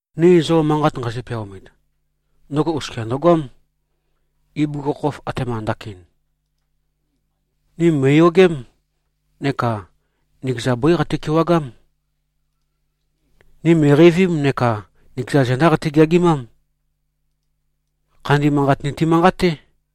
Ni zo manqat nqeizø-peaomit, ndøgo oskia ndøgoám, ibugukhokhof, atema ndakin. Ni mø̀iyogém, neka nikeza bøí qati-kewagám. Ni mø̀iqeivím, neka nikeza zendá qati-geagimám. Khandi Manqat niti-manqaté.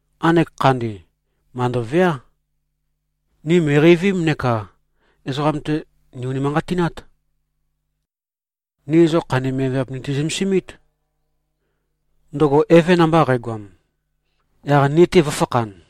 Nqanek Khandi, màndoveá. Ni mø̀iqeivím neka ezoqam-te, nì-unimanqatinát. Ni zo khandi miavmiav niti-zømesimít, ndøgo Eve namba qægoam, yaq ni-te vø̄fakhan.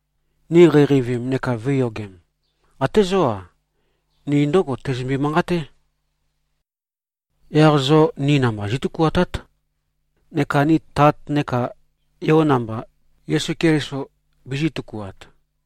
Ni qeiqeivim neka vø̄iyogem, até zó-a, ni ndǿgo teizømbe-manqaté. Yaq zo ni namba zí꞉tøkuatát, neka ni Tat neka Yo namba, Yesu Keliso, bizī꞉-tøkuat.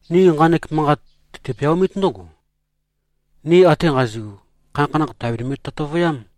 Ni nqanek manqat tøti-peaomít ndǿgo: Ni ate nqazi꞉gu, khanakhanakh, tàbinimbi-tøtøvøyám.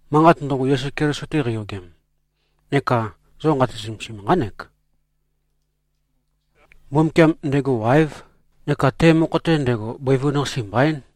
Manqat ndøgo, Yesu Keliso-te qeiyogem, neka zo nqati-zømesim, nqánek: Mbumbukiam, ndego wáev neka te mokho-te ndego, bøivun-qase mbaín.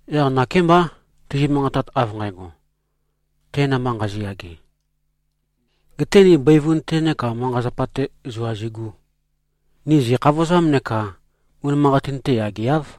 Yaq nakémbá, tizi-manqatat, av nqægo, te namba nqazi꞉-yage, gete ni bøivun-te neka manqa-zapa-te zua zigū, ni zì꞉khavozám neka unimanqatin-te yageáv.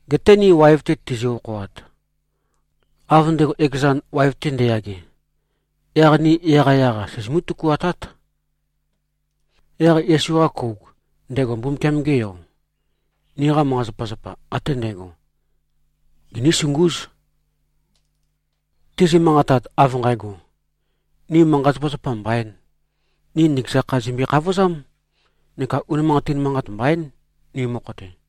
Geté ni waev-te tizi-okhoat, av ndego ekezan, waev-te nde꞉yage, yaq ni yaqyaq-a, sizimú-tøkuatát. Yaq Yesu-qa kouk, ndego Mbumbukiam-ge Yo, niqa manqa-zapazapa ate ndægo, ginísungúz. Tizi-manqatat, av nqægo, ni manqa-zapazapa mbaīn, ni nikeza kha, zìmbøe-khavozám neka unimanqatin manqat mbaín, ni mokho-te.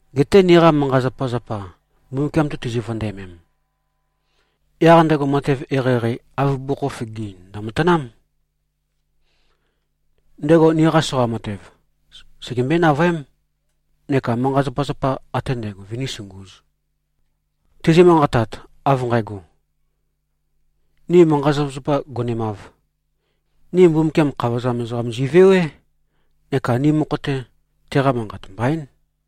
Geté niqa manqa-zapazapa Mbumbukiam-te tizi-vøndæmem, yaq ndego matev eqeieqei, av bugukhokhof ge꞉-ein, ndø̀matanám. Ndego niqa soqa matev, segembøé-navøém, neka manqa-zapazapa ate ndægo vønísungūz. Tizi-manqatat, av nqægo, ni manqa-zapazapa gonemāv, ni Mbumbukiam, khavozam ezoqam zi꞉vewé neka ni mokho-te, teqa manqat mbaín.